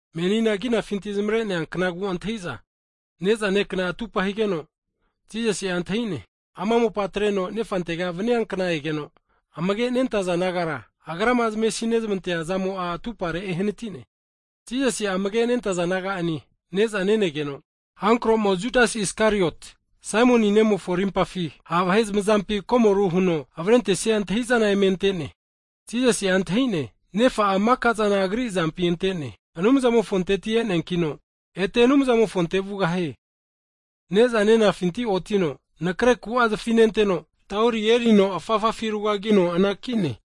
Menina kinafinti zamare'nea knagu antahimiza (Pasova) ne'za nekna atupa higeno, Jisasi'a antahi'ne, ama mopa atreno Nefantega vnia kna egeno, amage nentaza disaipol nagara, Agrama zamesi nezmantea zamo'a atupare ehnati'ne. Jisasi'a amage' nentaza disaipol naga'ane ne'za nenegeno, Hankromo (Sata) Judas Iskariot, Saimon nemofo rimpafi ha' vahe zamazampi komoru huno avrentesia antahi'zana eme ante'ne. Jisasi'a antahi'ne, Nefa'a maka'zana Agri azampi ante'ne, Anumzamofonteti e'neankino, ete Anumzamofonte vugahie. Ne'za nenafinti otino, anakre ku'a zafi nenteno, tauri erino afafafi rugagino anakine.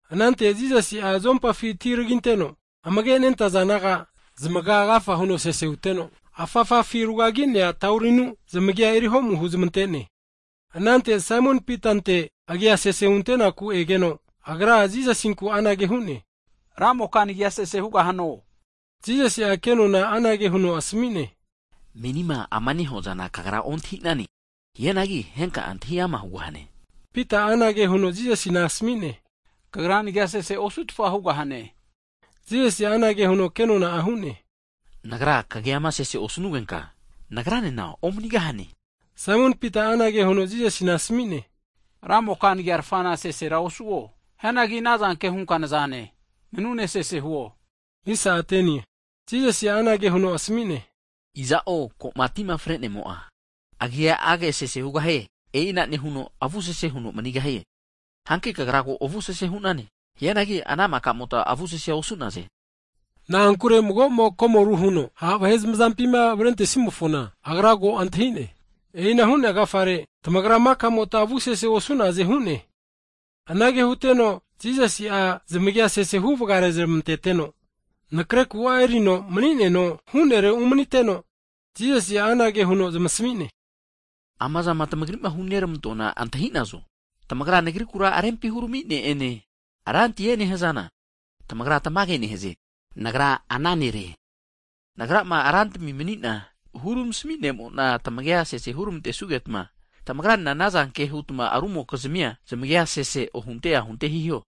Anante Jisasi'a zompafi ti taginteno, amage nentaza disaipol naga zamaga agafa huno sese huteno, afafafi rugagi'nea taurinu zamagia eriho'mu huzmante'ne. Anante Saimon Pitante aga sese hunte'naku egeno, agra Jisasinku anage hu'ne, Ramoka nagia sese hugahano? Jisasi'a kenona anage huno asmi'ne, menima ama nehuazana kagra ontahi'nane, hianagi henka'a antahi ama hugahane. Pita'a anage huno Jisasina asmi'ne, Kagra nagia sese osu'tfa hugahane! Jisasi anage huno kenona'a hu'ne, Nagra kagiama sese osnugenka, Nagranena omnigahane. Saimon Pita'a anage huno Jisasina asmi'ne, Ramoka nagiarfana sesera osuo, hianagi anazanke hunka nazane, nanune sese huo! Jisasi'a anage huno asmi'ne, iza'o ko'ma tima fre'nemo'a, agiage sese hugahie, e'ina nehuno avu sese huno mani'gahie. Hanki kagra ko avu sese hu'nane, hianagi ana maka'mota avu sese osu'naze. Na'ankure mago'mo komoru huno ha' vahe zamazampima avrentesimofona, Agra ko antahi'ne, e'ina hu'nea agafare, tamagra maka'mota avu sese osu'naze hu'ne. Anage huteno Jisasi'a zamagia sese huvga rezmantete'no, Nakre ku'a erino mani'neno hu'nere umniteno, Jisasi'a anage huno zamsmi'ne, amazama tmagri'ma hunermantoana antahi'nazo? Tamagra Nagrikura rempi hurami Ne'ene, Rantie nehazana, tamagra tamage nehaze, Nagra ana nere. Nagrama Rantimi manina, hurmasmi Ne'mona tmagia sese hunermantesugeta, tamagra nena anazanke huta rumokizmi zamagia, sese ohunte ahunte hiho.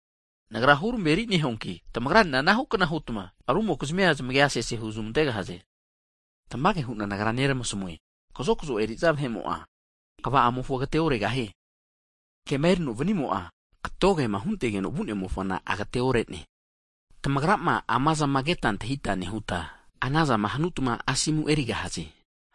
Nagra hurmeri nehuanki, tamagranena anahu kna hutma rumokizmi'a zamagia sese huzmantegahaze. Tamage hu'na Nagra nermasmue, kazokzo eri'za vahe'mo'a kva'amofona agateoregahie. Kema erino vnimo'a, katogema huntegeno vu'nemofona agateore'ne. Tamagrama amazama keta antahita nehuta, anazama hanutma asomu erigahaze.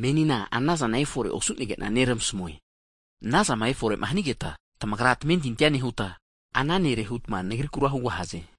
Meninena Nagra anazana efore osu'nege'na neramasmue, anazama efore'ma hanigeta, tamagra tamentinti nehuta, ana nere hutma Nagrikura hugahaze.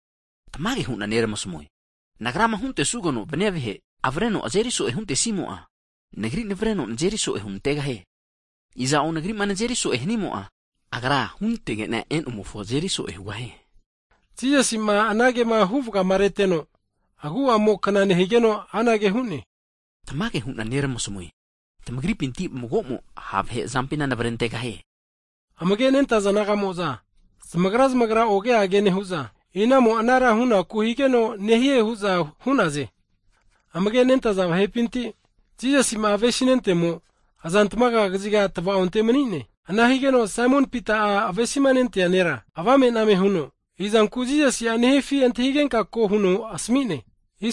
Tamage hu'na neramasmue, Nagrama huntesugeno vnia vahe, avreno azeri so'e huntesimo'a, Nagri navreno nazeri so'e hunantegahie. Iza'o Nagri'ma nazeri so'e hanimo'a, Agra hunantege'na e'nomofo azeri so'e hugahie. Jisasima anage huvgama reteno, agu'amo kna nehigeno anage hu'ne, Tamage hu'na nermasmue, tamagripinti mago'mo ha' vahe azampina navre antegahie. Amage nentaza disaipol naga'mo'za zamagra zamagra oge age nehu'za, inamo anara hunaku higeno nehie hu'za hu'naze. Amage' nentaza disaipol nagapinti, Jisasi'ma avesi nentemo, azantmaga kaziga tvaonte mani'ne. Ana higeno Saimon Pita'a avesima nentea disaipol ne'ra avame'name huno, izanku Jisasi'a nehifi antahigenka ko huno asmni'ne.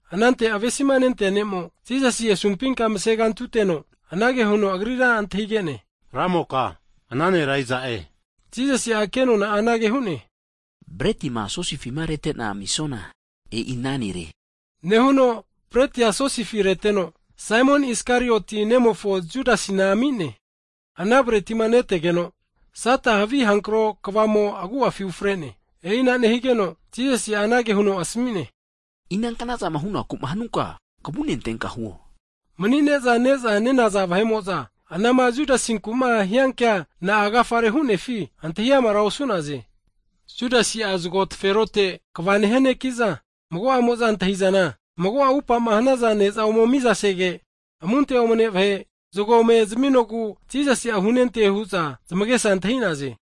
Anante avesima nentea ne'mo, Jisasi asumpi mase kantiteno, anage huno Agrira antahige'ne, Ramoka ana nera iza'e? Jisasi'a kenona anage hu'ne, bretima sosifima rete'na amisuana e'i ana nere, nehuno bretia sosifi reteno, Saimon Iskarioti nemofo Judasina ami'ne. Ana bretima netegeno, Sata'a havi avamumofo kvamo agu'afi ufre'ne. E'ina nehigeno Jisasi anage huno asmi'ne, ina knazama hunaku'ma hnunka, kvune antenka huo. Mani'ne'za ne'za ne'naza vahe'mo'za, anama Judasinku'ma hia kea na'a agafare hu'nefi, antahi amara osu'naze. Judasi zgo taferote (bogisi) kva nehia neki'za, mago'amo'za antahizana mago'a upama hunona ne'za ome miza sege, amunte omne vahe, zgo ome zaminogu Jisasi'a hunente hu'za zamagesa antahi'naze.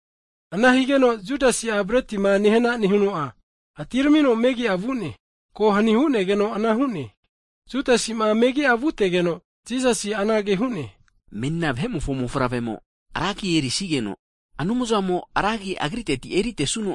Ana higeno, Judasi'a bretima nehana nehuno'a, atiramino megi'a vu'ne. (Ko hani hu'negeno ana hu'ne.) Judasi'ma megi'a vute'geno, Jisasi anage hu'ne, menina Vahemofo Mofavremo ra agi erisigeno, Anumzamo'a ra agi Agriteti eri'nia kna ne-e.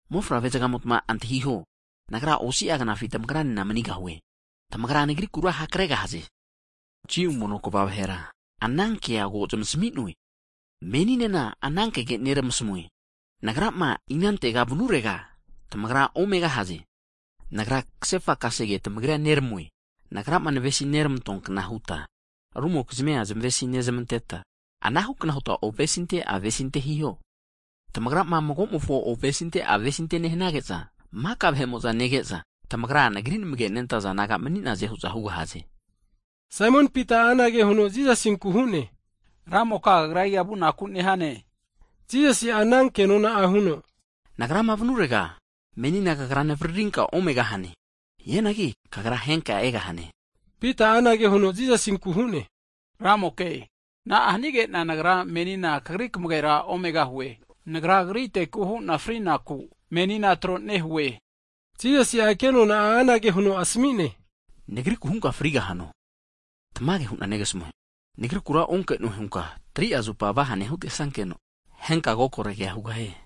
Mofavre zgamota antahiho, Nagra osi'a knafi tamagra nena manigahue. Tamagra Nagrikura hakregahaze, Jiu mono kva vahera anankea ko zamasmi'noe. Meninena ana kege nermasmue, Nagrama inantega vnurega tamagra omegahaze. Nagra kasefa kasege tamagrira neramue, Nagrama navesi neramantoa kna huta rumokizmia zmesinezmanteta, anahu kna hutma ovesinte avesinte hiho. Tamagrama mago'mofo ovesinte avesinte nehnage'za, maka vahe'mo'za nege'za, tamagra Nagri namage nentaza disaipol naga mani'naze hu'za hugahaze. Saimon Pita'a anage huno Jisasinku hu'ne, Ramoka, kagra iga vunaku nehane higeno? Jisasi'a ana kenona'a huno, Nagrama vanurega, menina kagra navaririnka omegahane, hianagi kagra henka egahane. Pita'a anage Jisasinku hu'ne, Ramoke, na'a hanige'na nagra menina Kagri kmagera omegahue? Nagra Kagriteku hu'na frinaku menina tro nehue. Jisasi'a kenona'a anage huno asmi'ne, Nagriku hunka frigahano? Tamage hu'na negasmue, Nagrikura onke'noe hunka 3'a zupa vahane hutesankeno, henka kokoregea hugahie.